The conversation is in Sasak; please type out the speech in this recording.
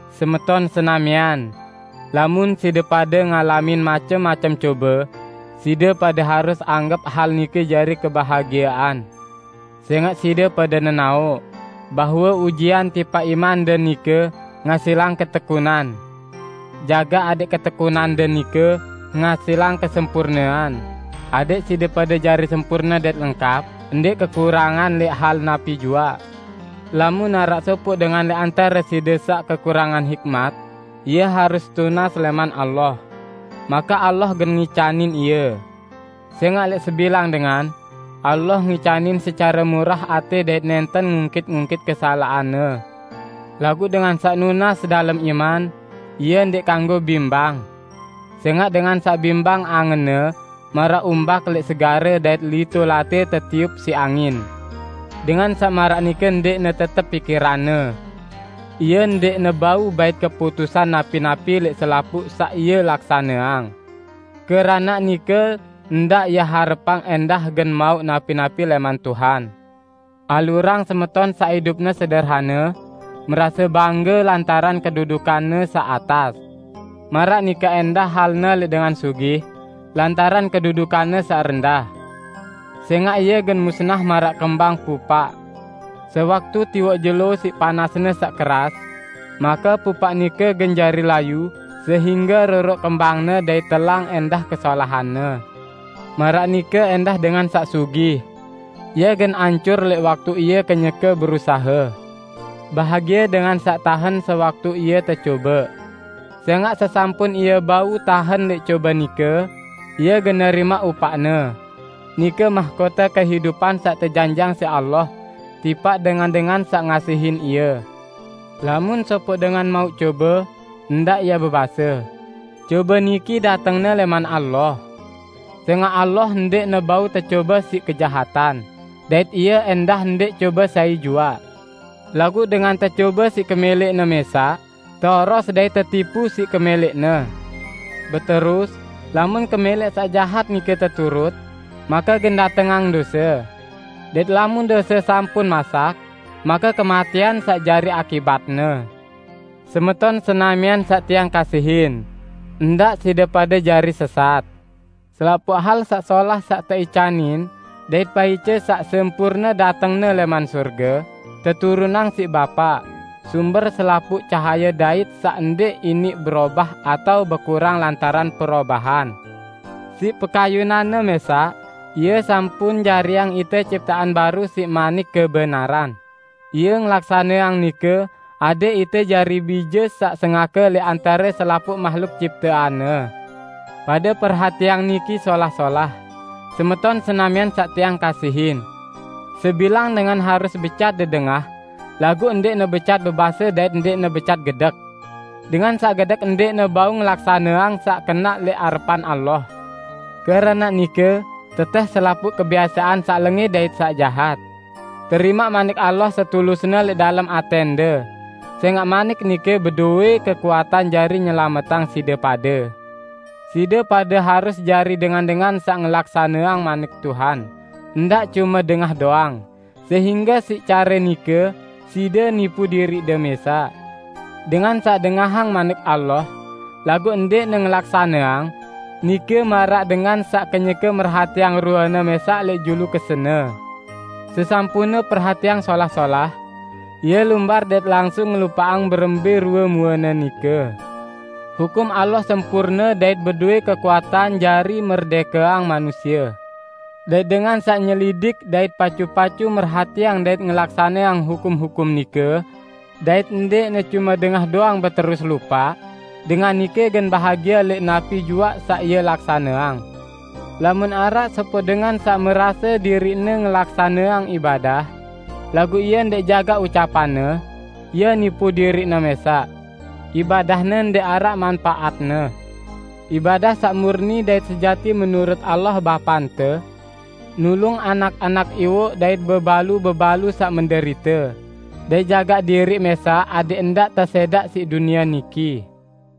Semeton senamian! Lamun side pade ngalamin macem-macem cobe, side pade harus anggep hal nike jari kebahagiean. Sẽngaq side pade nenaoq, bahwe ujian tipaq imande nike ngasilang ketekunan. Jagaq adẽq ketekunande nike ngasilang kesempurnean, adẽq side pade jari sempurne dait lengkap, ndẽq kekurangan lẽq hal napi juaq. Lamun araq sopoq dengan lẽq antare side saq kekurangan hikmat, ie harus tunas lẽman Allah, make Allah gen ngicanin ie; sẽngaq lẽq sebilang dengan, Allah ngicanin secare murah atẽ dait nẽnten ngungkit-ngungkit kesalaqanne. Laguq dengan saq nunas dalem iman, ie ndẽq kanggo bimbang. Sẽngaq dengan saq bimbang angenne maraq umbak lẽq segare dait lito latẽ tetiup siq angin. Dengan saq maraq nike ndẽqne tetep pikiranne; ie ndẽqne bau bait keputusan napi-napi lẽq selapuq saq ie laksaneang. Keranaq nike ndaq ie harepang ẽndah gen mauq napi-napi lẽman Tuhan. Alurang semeton saq idupne sederhane merase bangge lantaran kedudukanne saq atas. Maraq nike ẽndah halne lẽq dengan sugih lantaran kedudukanne saq rendah, sẽngaq ie gen musnah maraq kembang pupaq. Sewaktu tiwoq jelo siq panasne saq keras, make pupaq nike gen jari layu sehingge roroq kembangne dait telang ẽndah kesolahanne. Maraq nike ẽndah dengan saq sugih; ie gen ancur lẽq waktu ie kenyeke berusahe. Bahagie dengan saq tahen sewaktu ie tecobe. Sẽngaq sesampun ie bau tahen lẽq cobe nike, ie gen nerimaq upaqne, nike mahkote kehidupan saq tejanjiqang siq Allah tipaq dengan-dengan saq ngasihin Ie. Lamun sopoq dengan mauq cobe, ndaq ie bebase, "Cobe niki datengne lẽman Allah!" Sẽngaq Allah ndẽqne bau tecobe siq kejahatan, dait Ie ẽndah ndẽq cobe sai juaq. Laguq dengan tecobe siq kemẽlẽqne mẽsaq, teoros dait tetipu siq kemẽlẽqne. Beterus, lamun kemẽlẽq saq jahat nike teturut, make gen datengang dose; dait lamun dose sampun masak, make kematẽan saq jari akibatne. Semeton senamian saq tiang kasihin; ndaq side pade jari sesat. Selapuq hal saq solah saq teicanin dait paice saq sempurne datengne lẽman sorge, teturunang siq Bapa, sumber selapuq cahaye dait saq ndẽq iniq berobah atao bekurang lantaran perobahan. Siq pekayunan-Ne mẽsaq Ie sampun jariang ite ciptean baru siq manik kebenaran, Ie ngelaksaneang nike adẽq ite jari bije saq sengake lẽq antare selapuq mahluk ciptean-Ne. Pade perhatiang niki solah-solah, semeton senamian saq tiang kasihin! Sebilang dengan harus becat dedengah, laguq ndẽqne becat bebase dait ndẽqne becat gedek. Dengan saq gedek ndẽqne bau ngelaksaneang saq kenaq lẽq arepan Allah. Keranaq nike, tetẽh selapuq kebiasean saq lengẽ dait saq jahat. Terimaq Manik Allah setulusne lẽq dalem atẽnde, sẽngaq Manik nike bedowẽ kekuatan jari nyelametang side pade. Side pade harus jari dengan-dengan saq ngelaksaneang Manik Tuhan, ndaq cume dengah doang, sehingge siq care nike side nipu diriqde mẽsaq. Dengan saq dengahang Manik Allah, laguq ndẽqne ngelaksaneang, nike maraq dengan saq kenyeke merhatiang ruene mẽsaq lẽq julu kesene. Sesampunne perhatiang solah-solah, ie lumbar dait langsung ngelupaqang berembẽ rue muene nike. Hukum Allah sempurne dait bedowẽ kekuatan jari merdẽkeang manusie. Dait dengan saq nyelidik dait pacu-pacu merhatiang dait ngelaksaneang hukum-hukum nike, dait ndẽqne cume dengah doang beterus lupaq, dengan nike gen bahagie lẽq napi juaq saq ie laksaneang. Lamun araq sopoq dengan saq merase diriqne ngelaksaneang ibadah, laguq ie ndẽq jagaq ucapanne, ie nipu diriqne mẽsaq; ibadahne ndẽq araq manpaatne. Ibadah saq murni dait sejati menurut Allah Bapante: Nulung anak-anak iwoq dait bebalu-bebalu saq menderite, dait jagaq diriq mẽsaq adẽq ndaq tesẽdaq siq dunie niki.